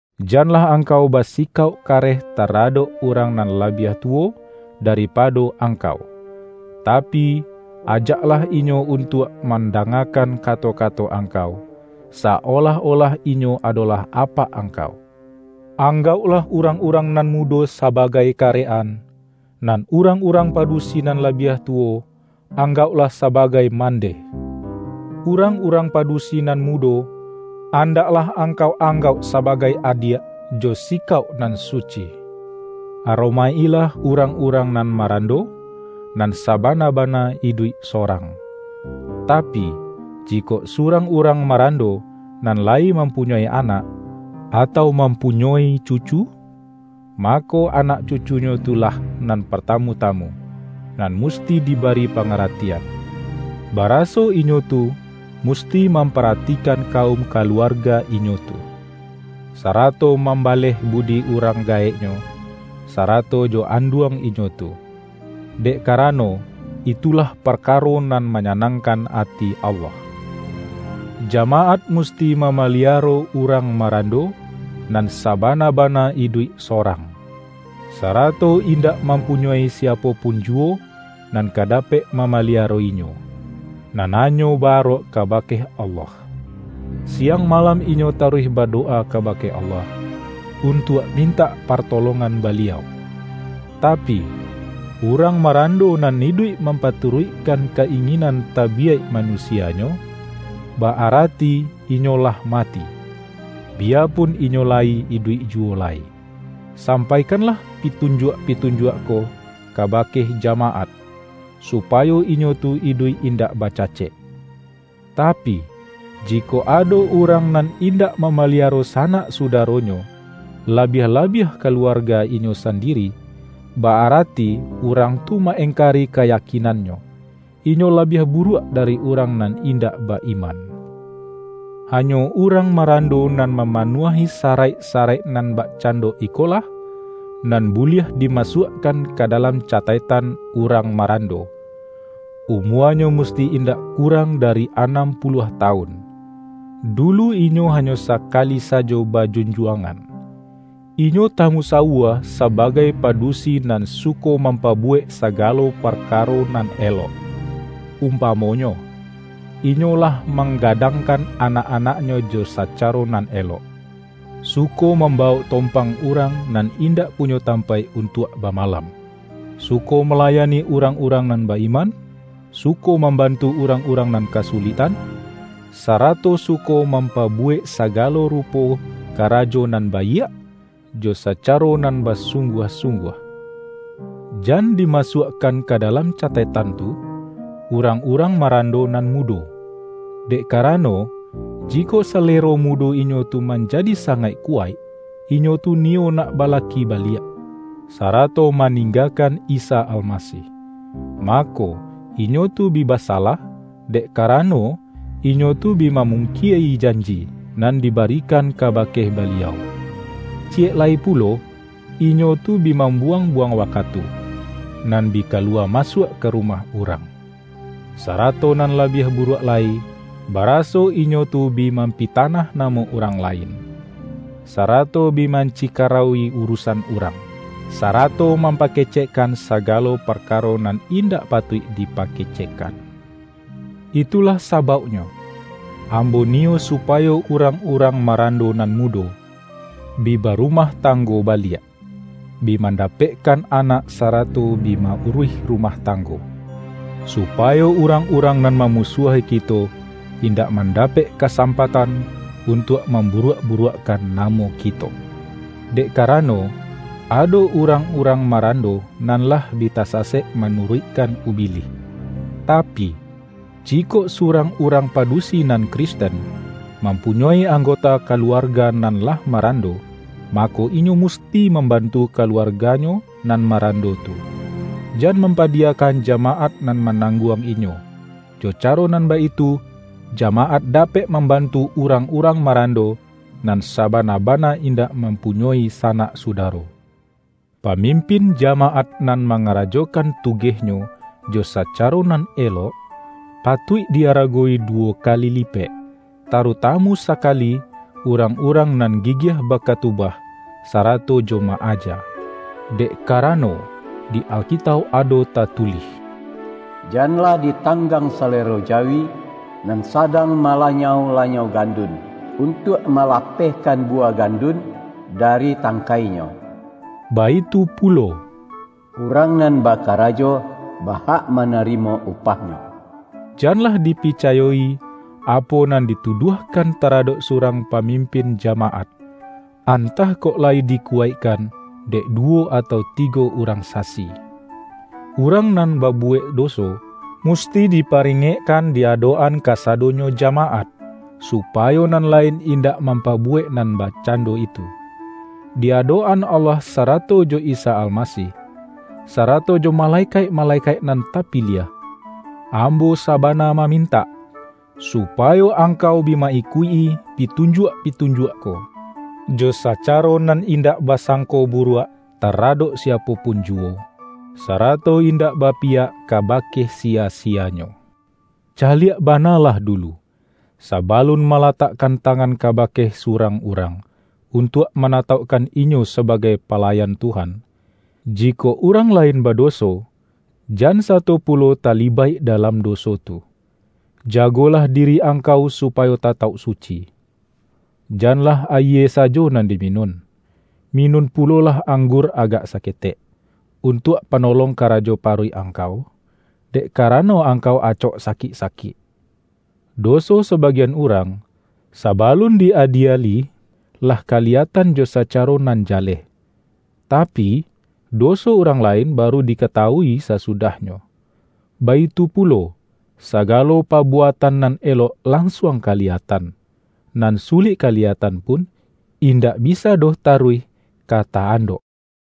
Janlah angkau basikauk kareh ta-radok urang nan labiah tuwo da-ripado angkau, tapi, ajaklah inyo un-tuak mandangakan kato-kato angkau, sa-olah-olah inyo adolah apak angkau. Anggauklah urang-urang nan mudo sabagai karek-an, nan urang-urang padusi nan labiah tuwo, anggauklah sabagai mandeh. Urang-urang padusi nan mudo, andaklah angkau anggauk sabagai adiak, jo sikauk nan suci. Aromaik-ilah urang-urang nan ma-rando, nan sabana-bana iduik sorang. Tapi, jikok surang urang marando, nan layi mampunyoi anak, atau mam-punyoi cucu, mako, anak cucunyo tu lah nan partamu-tamu, nan musti di-bari pangaratian, baraso inyo tu mus-ti mamparatikan kaum kaluarga inyo tu, sarato mambaleh budi urang ga-eknyo, sarato jo anduang inyo tu. Dek karano, itulah parkaro nan ma-nyanangkan ati Allah. Jamaat mus-ti mamaliaro urang marando nan sa-bana-bana iduik sorang, sarato indak mampunyoi siapo pun juwo nan ka dapek mamaliaro inyo, nan hanyo ba-arok kabake Allah. Siang malam inyo taruih badowa kabake Allah, untuak mintak partolongan Baliau. Tapi, urang marando nan iduik mampatu-ruikkan ka-inginan tabiyaik manusia-nyo, ba-arati inyo lah mati, biyapun inyo layi iduik juwo lai. Sampai-kanlah pitunjuak-pitunjuak ko kaba-ke jamaat, supayo inyo tu iduik in-dak bacacek. Tapi, jikok ado urang nan indak mamaliaro sanak sudaro-nyo, labiah-labiah kaluarga inyo sandiri, ba-arati urang tu ma-engkari ka-yakinannyo; inyo labiah buruak dari urang nan indak ba-iman. Hanyo urang marando nan ma-manuahi saraik-saraik nan bakcan-do iko lah, nan buliah dimasuakkan ka dalam cataiktan urang marando: umuanyo musti indak kurang dari anam puluah tawun, dulu inyo ha-nyo sakali sajo bajunjuangan, inyo tamusawua sabagai padusi nan su-ko mampabuwek sagalo parkaro nan elok, umpamonyo, inyo lah mang-gadangkan anak-anaknyo jo sacaro nan elok, suko mambawok tompang urang nan indak punyo tampaik un-tuak bamalam, suko malayani urang-urang nan ba-iman, suko mambantu urang-urang nan kasuliktan, sarato suko mampabuwek sagalo rupo kara-jo nan baiak, jo sacaro nan basung-guah-sungguah. Jan dimasuakkan ka dalam ca-taiktan tu, urang-urang marando nan mudo. Dek karano, jikok salero mu-do inyo tu manjadi sangaik kuwaik, inyo tu niyo nak balaki baliak, sarato maninggakan Isa Almasih. Mako, inyo tu bi basalah, dek karano, inyo tu bi mamungkie-i janji, nan dibari-kan kabake Baliau. Ciyek lai pulo, inyo tu bi mambuwang-buwang wa-katu, nan bi kaluwa masuak ka rumah urang. Sarato nan labiah buruak lai, baraso inyo tu bi mampitanah namo urang lain, sarato bi mancikarauwi urusan urang, sarato mampakecek-kan sagalo parkaro nan indak patuik dipakecekkan. Itulah sabauknyo, ambo niyo supayo urang-urang ma-rando nan mudo, bi barumah tang-go baliak, bi mandapekkan anak sara-to bi ma-uruih rumah tanggo, supayo urang-urang nan mamusuahi kito in-dak mandapek kasampatan, untuak mamburuak-buruakkan namo kito. Dek karano, ado urang-urang ma-rando nan lah bi tasasek manuruikkan Ubilih. Tapi, jikok surang urang pa-dusi nan Kristen, mampunyoi anggota kaluarga nan lah marando, mako, inyo musti mambantu kaluarganyo nan marando tu; jan mampadiyakan jamaat nan manangguang inyo. Jo ca-ro nan baitu, jamaat dapek mamban-tu urang-urang marando, nan sabana-bana indak mampunyoi sanak sudaro. Pamimpin jamaat nan mangarajo-kan tugehnyo jo sacaro nan elok, pa-tuik di-aragowi duwo kali lipek, taru-tamu sakali urang-urang nan gigiah bakatubah, sarato jo ma-aja. Dek karano, di Alkitauk ado tatulih,”Jan-lah ditanggang salero jawi nan sa-dang malanyau-lanyau gandun, un-tuak malapehkan buwah gandun dari tangkainyo”, baitu pulo,”Urang nan bakarajo, ba-hak manarimo upah-nyo”. Janlah dipicayo-i, apo nan dituduahkan taradok surang pamim-pin jamaat, antah kok layi dikuwaik-kan, dek duwo atau tigo urang sasi. Urang nan babuwek doso, musti di-paringekkan di adok-an kasadonyo ja-maat, supayo nan lain indak mampa-buwek nan bakcando itu. Di adok-an Allah sarato jo Isa Almasih, sarato jo malekaik-male-kaik nan tapiliah, ambo sabana ma-mintak, supayo angkau bi ma-ikuik-i pitunjuak-pitunjuak ko, jo sacaro nan indak basangko buruak taradok siapo pun juwo, sarato indak bapiyak ka-bake siya-siyanyo. Caliak bana lah dulu, sabalun malatakkan tangan ka-bake surang urang, untuak manatauk-kan inyo sabagai palayan Tuhan. Ji-kok urang lain badoso, jan sato pulo talibaik dalam doso tu. Jagolah diri angkau supayo tatauk suci. Janlah ayie sajo nan diminun; minun pulolah anggur agak saketek, untuak panolong karajo paruik ang-kau, dek karano angkau acok sakik-sakik. Doso sabagian urang, sabalun di-adieli, lah kaliyatan jo sacaro nan ja-leh. Tapi, doso urang lain baru dikata-wui sasudahnyo. Baitu pulo, sagalo pabuatan nan elok lansuang kaliya-tan. Nan sulik kaliyatan pun, indak bisa doh taruih ka ta-and ok.